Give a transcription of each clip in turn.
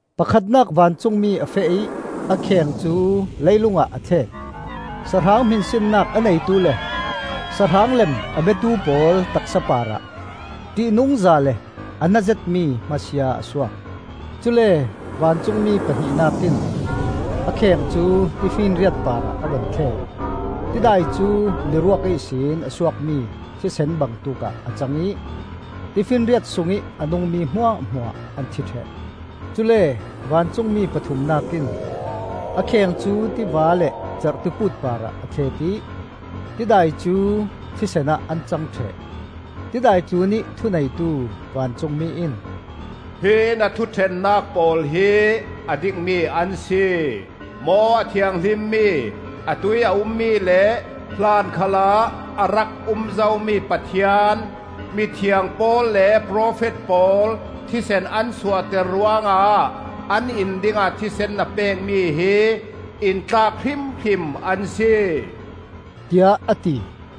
Pakhatnak vancungmi a feh ih a kheng cu leilungah a thlet. Sahrang hminsinnak a neitu le sahrang lem a biatu pawl taksa parah ṭihnungza le a na zetmi hma sia a suak. Cule vancungmi pahnihnak in a kheng cu tifinriat parah a vun thlet. Tidai cu miruak ihsin a suakmi thisen bangtuk ah a cang ih tifinriat sungih a nungmi hmuahhmuah an thi ṭheh. Cule vancungmi pathumnak in a kheng cu tiva le cerhtiput parah a thlet ih tidai cu thisen ah an cang ṭheh. Tidai tlunih thuneitu vancungmi in, “Hi na thuṭhennak pawl hi a dikmi an si, Maw a Thianghlimmi, atuih a ummi le hlan khalah a rak um zomi Pathian! Mithiang pawl le profet pawl thisen an suahter ruangah an in dingah thisen na pekmi hi in tlak hrimhrim an si,” tiah a ti.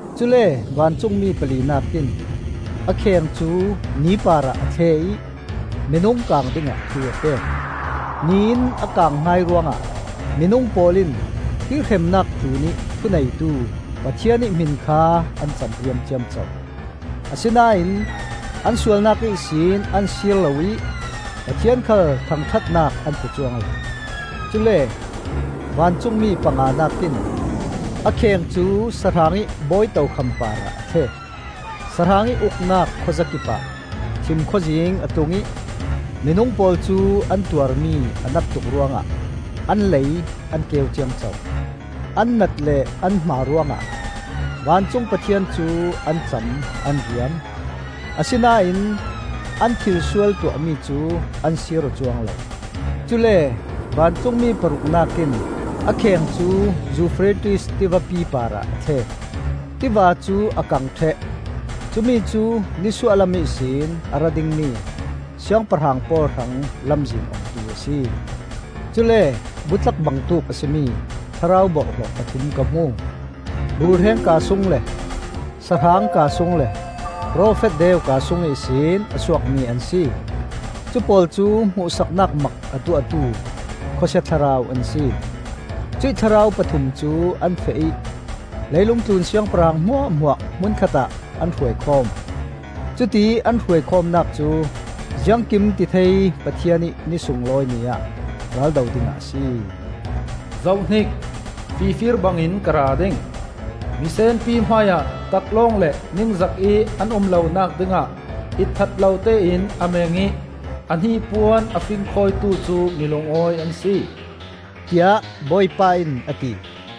Cule vancungmi palinak in a kheng cu ni parah a thle ih minung kang dingah thu a pek. Ni in a kang hai ruangah minung pawl in hi hremnak tlunih thuneitu Pathian ih hmin kha an camriam ciamco. Asinain an sualnak ihsin an sir lo ih Pathian khal thangṭhatnak an pe cuang lo. Cule vancungmi panganak in a kheng cu sahrang ih bawi tokham parah a thlet. Sahrang ih uknak khuazakip ah thimkhawzing a tlung ih minung pawl cu an tuarmi a nat tuk ruangah an lei an keu ciamco. An nat le an hma ruangah vancung Pathian cu an cam an riam. Asinain an thilsual tuahmi cu an sir aw cuang lo. Cule vancungmi paruknak in a kheng cu Eufrates tivapi parah a thlet. Tiva cu a kang ṭheh; cumicu nisuahlam ihsin a ra dingmi siangpahrang pawl hrang lamzin ongtu a si. Cule butlak bangtuk a si mi thlarau borhhlawh pathum ka hmu. Rulhreng kaa sung le sahrang kaa sung le profet deu kaa sung ihsin a suakmi an si. Cupawl cu hmuhsaknak mak a tuahtu khawsia thlarau an si. Cuih thlarau pathum cu an feh ih leilung tlun siangpahrang hmuahhmuah hmun khatah an hruai khawm. Cutiih an hruai khawmnak cu Ziangkimtithei Pathian ih Ni sunglawi ni ah raldo dingah a si. “Zohhnik! Fifir bangin ka ra ding. Misenpi hmaiah taklawng le ningzakih an um lonak dingah itthat lotein a meng ih a hnipuan a fingkhawitu cu mi lungawi an si,” tiah Bawipa in a ti.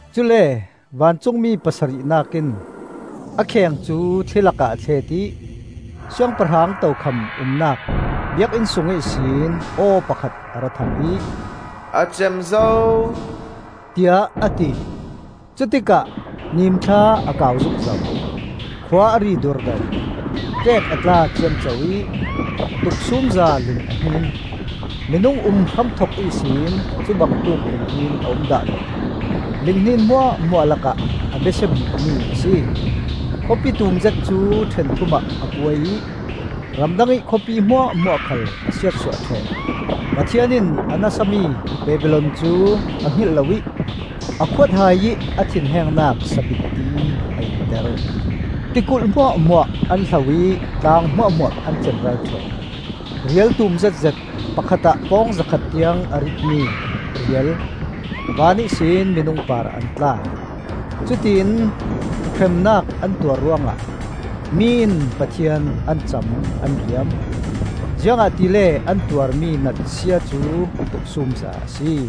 Cule vancungmi pasarihnak in a kheng cu thli lakah a thlet ih Siangpahrang tokham umnak biakinn sung ihsin aw pakhat a ra thang ih, “A cem zo,” tiah a ti. Cutikah nimthla a kau zukzo, khua a ri durdo, ṭeek a tla ciamco ih tuksumza ling a hnin. Minung um hramthok ihsin cubangtuk linghnin a um dah lo. Linghnin hmuahhmuah lakah a besia bikmi a si. Khawpi tumzet cu ṭhenthum ah a kuai ih ram dangih khawpi hmuahhmuah khal a siatsuah ṭheh. Pathian in a nasami Babilon cu a hngilh loih a khuathaiih a thinhengnak sabitti a inter. Tikulh hmuahhmuah an hlo ih tlang hmuahhmuah an cemral ṭheh. Rial tum zetzet, pakhat ah pawng zakhat tiang a ritmi rial van ihsin minung parah an tla. Cutiin hremnak an tuar ruangah mi in Pathian an cam an riam, ziangahtile an tuarmi natsia cu tuksumza a si.